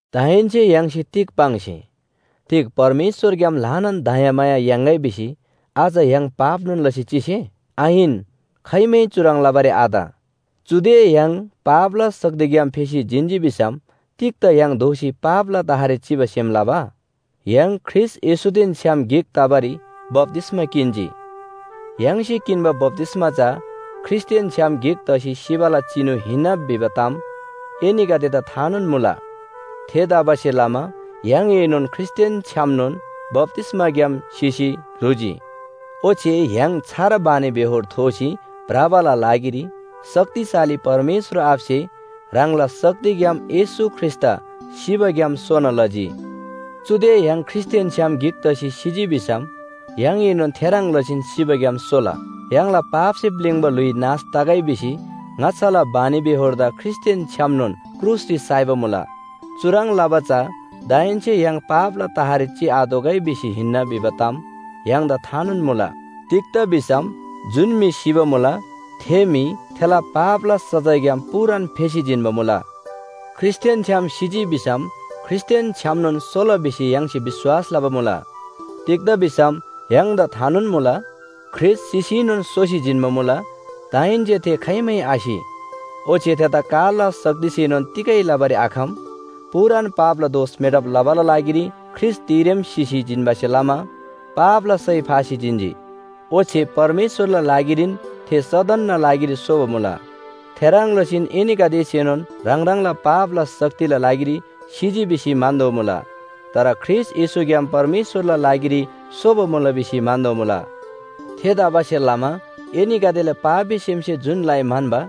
दाहेन्‍से य्‍हाङसे तिग पाङ्से? तिग परमेश्‍वरग्‍याम ल्‍हानान दयामाया याङ्‌गै भिसी अझ य्‍हाङ पापनोन लसी चिसे? आहिन, खाइमै चुह्रङ् लबारी आत। चुदे य्‍हाङ पापला शक्तिग्‍याम फेसी जिन्‍जी भिसम तिग्‍दा य्‍हाङ दोःसी पापला तहरी चिबा सेम लबा? य्‍हाङ ख्रीष्‍ट येशूदेन छ्‌याम गिक तबारी बप्‍तिस्‍मा किन्‍जी। य्‍हाङसे किन्‍बा बप्‍तिस्‍मा चा ख्रीष्‍टदेन छ्‌याम गिक तसी सिबाला चिनु हिन्‍ना भिबा ताम एनीगदेदा थानोन मुला। थेतबासेलमा य्‍हाङएनोन ख्रीष्‍टदेन छ्‌यामनोन बप्‍तिस्‍माग्‍याम सिसी ल्‍हुजी। ओच्‍छे य्‍हाङ छार बानीबेहोर थोसी भ्रबाला लागिरी शक्तिशाली परमेश्‍वर आबासे ह्राङला शक्तिग्‍याम येशू ख्रीष्‍टदा सिबाग्‍याम सोना लजी। चुदे य्‍हाङ ख्रीष्‍टदेन छ्‌याम गिक तसी सिजी भिसम य्‍हाङएनोन थे ह्रङ् लसीन सिबाग्‍याम सोला। य्‍हाङला पापसे प्‍लिङ्बा ल्‍हुइ नाश तगै भिसी ङाच्‍छाला बानीबेहोरदा ख्रीष्‍टदेन छ्‌यामनोन क्रुसरी साइबा मुला। चुह्रङ् लबा चा दाहेन्‍से य्‍हाङ पापला तहरी चिआतोःगै भिसी हिन्‍ना भिबा ताम य्‍हाङदा थानोन मुला। तिग्‍दा भिसम जुन म्‍हि सिबा मुला थे म्‍हि थेला पापला सजायग्‍याम पूरान फेसी जिन्‍बा मुला। ख्रीष्‍टदेन छ्‌याम सिजी भिसम ख्रीष्‍टदेन छ्‌यामनोन सोला भिसी य्‍हाङसे विश्‍वास लबा मुला। तिग्‍दा भिसम य्‍हाङदा थानोन मुला, ख्रीष्‍ट सिसीनोन सोसी जिन्‍बा मुला। दाहेन्‍से थे खाइमै आसि, ओच्‍छे थेदा कालला शक्तिसेनोन तिगै लबारी आखम। पूरान पापला दोष मेटब लबाला लागिरी ख्रीष्‍ट तिरेम सिसी जिन्‍बासे लमा पापला सय फासी जिन्‍जी। ओच्‍छे परमेश्‍वरला लागिरीन थे सदनना लागिरी सोबा मुला। थेह्रङ् लसीन एनीगदेसेनोन ह्राङ ह्राङला पापला शक्तिला लागिरी सिजी भिसी म्‍हन्‍तोःमुला। तर ख्रीष्‍ट येशूग्‍याम परमेश्‍वरला लागिरी सोबा मुला भिसी म्‍हन्‍तोःमुला। थेतबासेलमा एनीगदेला पापी सेमसे जुन लइ म्‍हन्‍बा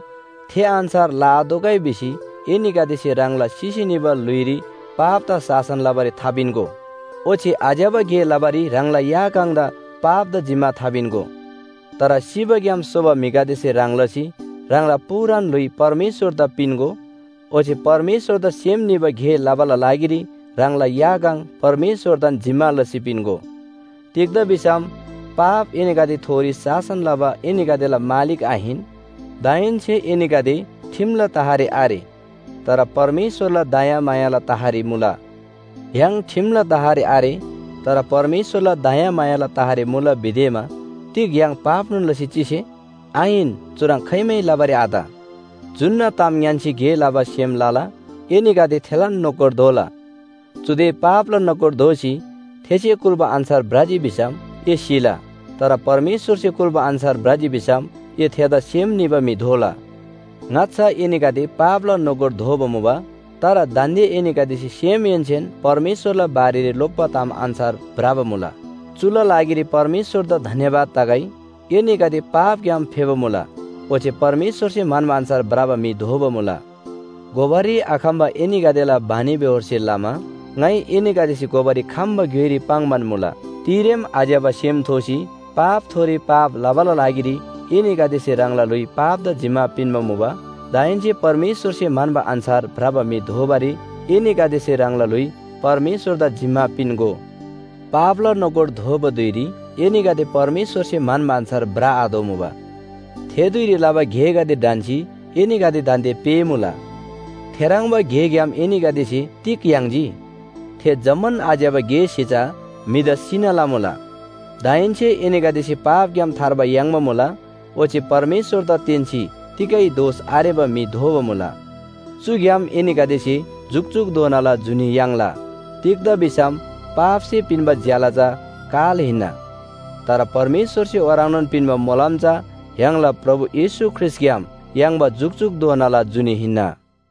थे अन्‍छार लआतोःगै भिसी एनीगदेसे ह्राङला सिसी निबा ल्‍हुइरी पापदा शासन लबारी थापिन्‍गो। ओच्‍छे आज्‍यबा गे लबारी ह्राङला या काङ पापदा जिम्‍मा थापिन्‍गो। तर सिबाग्‍याम सोबा म्‍हिगदेसे ह्रङ् लसी ह्राङला पूरान ल्‍हुइ परमेश्‍वरदा पिन्‍गो, ओच्‍छे परमेश्‍वरदा सेम निबा गे लबाला लागिरी ह्राङला या काङ परमेश्‍वरदान जिम्‍मा लसी पिन्‍गो। तिग्‍दा भिसम पाप एनीगदेथोरी शासन लबा एनीगदेला मालिक आहिन, दाहेन्‍से एनीगदे ठिमला तहरी आरे, तर परमेश्‍वरला दयामायाला तहरी मुला। य्‍हाङ ठिमला तहरी आरे, तर परमेश्‍वरला दयामायाला तहरी मुला भिदेमा तिग य्‍हाङ पापनोन लसी चिसे? आहिन, चुह्रङ् खाइमै लबारी आत। जुन्‍ना ताम ङ्‌यान्‍सी गे लबा सेम लला एनीगदे थेलान नोकर दोला। चुदे पापला नोकर दोसी थेसे कुल्‍बा अन्‍छार भ्रजी भिसम ए सिला, तर परमेश्‍वरसे कुल्‍बा अन्‍छार भ्रजी भिसम ए थेदा सेम निबा म्‍हि दोला। ङाच्‍छा एनीगदे पापला नोकर दोबा मुबा। तर दान्‍दे एनीगदेसे सेमहेन्‍सेन परमेश्‍वरला बारेरी लोप्‍बा ताम अन्‍छार भ्रबा मुला। चुला लागिरी परमेश्‍वरदा धन्‍यवाद तगै। एनीगदे पापग्‍याम फेबा मुला, ओच्‍छे परमेश्‍वरसे म्‍हन्‍बा अन्‍छार भ्रबा म्‍हि दोबा मुला। घोबारी आखम्‍बा एनीगदेला बानीबेहोरसे लमा ङाइ एनीगदेसे घोबारी खम्‍बा ग्‍योइरी पाङ्‌बान मुला। तिरेम आज्‍यबा सेम थोसी पापथोरी पाप लबाला लागिरी एनीगदेसे ह्राङला ल्‍हुइ पापदा जिम्‍मा पिन्‍बा मुबा। दाहेन्‍से परमेश्‍वरसे म्‍हन्‍बा अन्‍छार भ्रबा म्‍हि दोबारी एनीगदेसे ह्राङला ल्‍हुइ परमेश्‍वरदा जिम्‍मा पिन्‍गो। पापला नोकर दोबा धुइरी एनीगदे परमेश्‍वरसे म्‍हन्‍बा अन्‍छार भ्रआतोःमुबा। थे धुइरी लबा गेगदे ढन्‍सी एनीगदे दान्‍दे पेःमुला, थेह्रङ्बा गेग्‍याम एनीगदेसे तिग याङ्जी? थे जम्‍मान आज्‍यबा गेसे चा म्‍हिदा सिना लमुला। दाहेन्‍से एनीगदेसे पापग्‍याम थार्बा याङ्बा मुला, ओच्‍छे परमेश्‍वरदा तेन्‍सी तिगै दोष आरेबा म्‍हि दोबा मुला। चुग्‍याम एनीगदेसे जुकजुकधोनाला जुनी याङ्ला। तिग्‍दा भिसम पापसे पिन्‍बा ज्‍याला चा काल हिन्‍ना, तर परमेश्‍वरसे ओह्रङ्नोन पिन्‍बा मोलम चा य्‍हाङला प्रभु येशू ख्रीष्‍टग्‍याम याङ्बा जुकजुकधोनाला जुनी हिन्‍ना।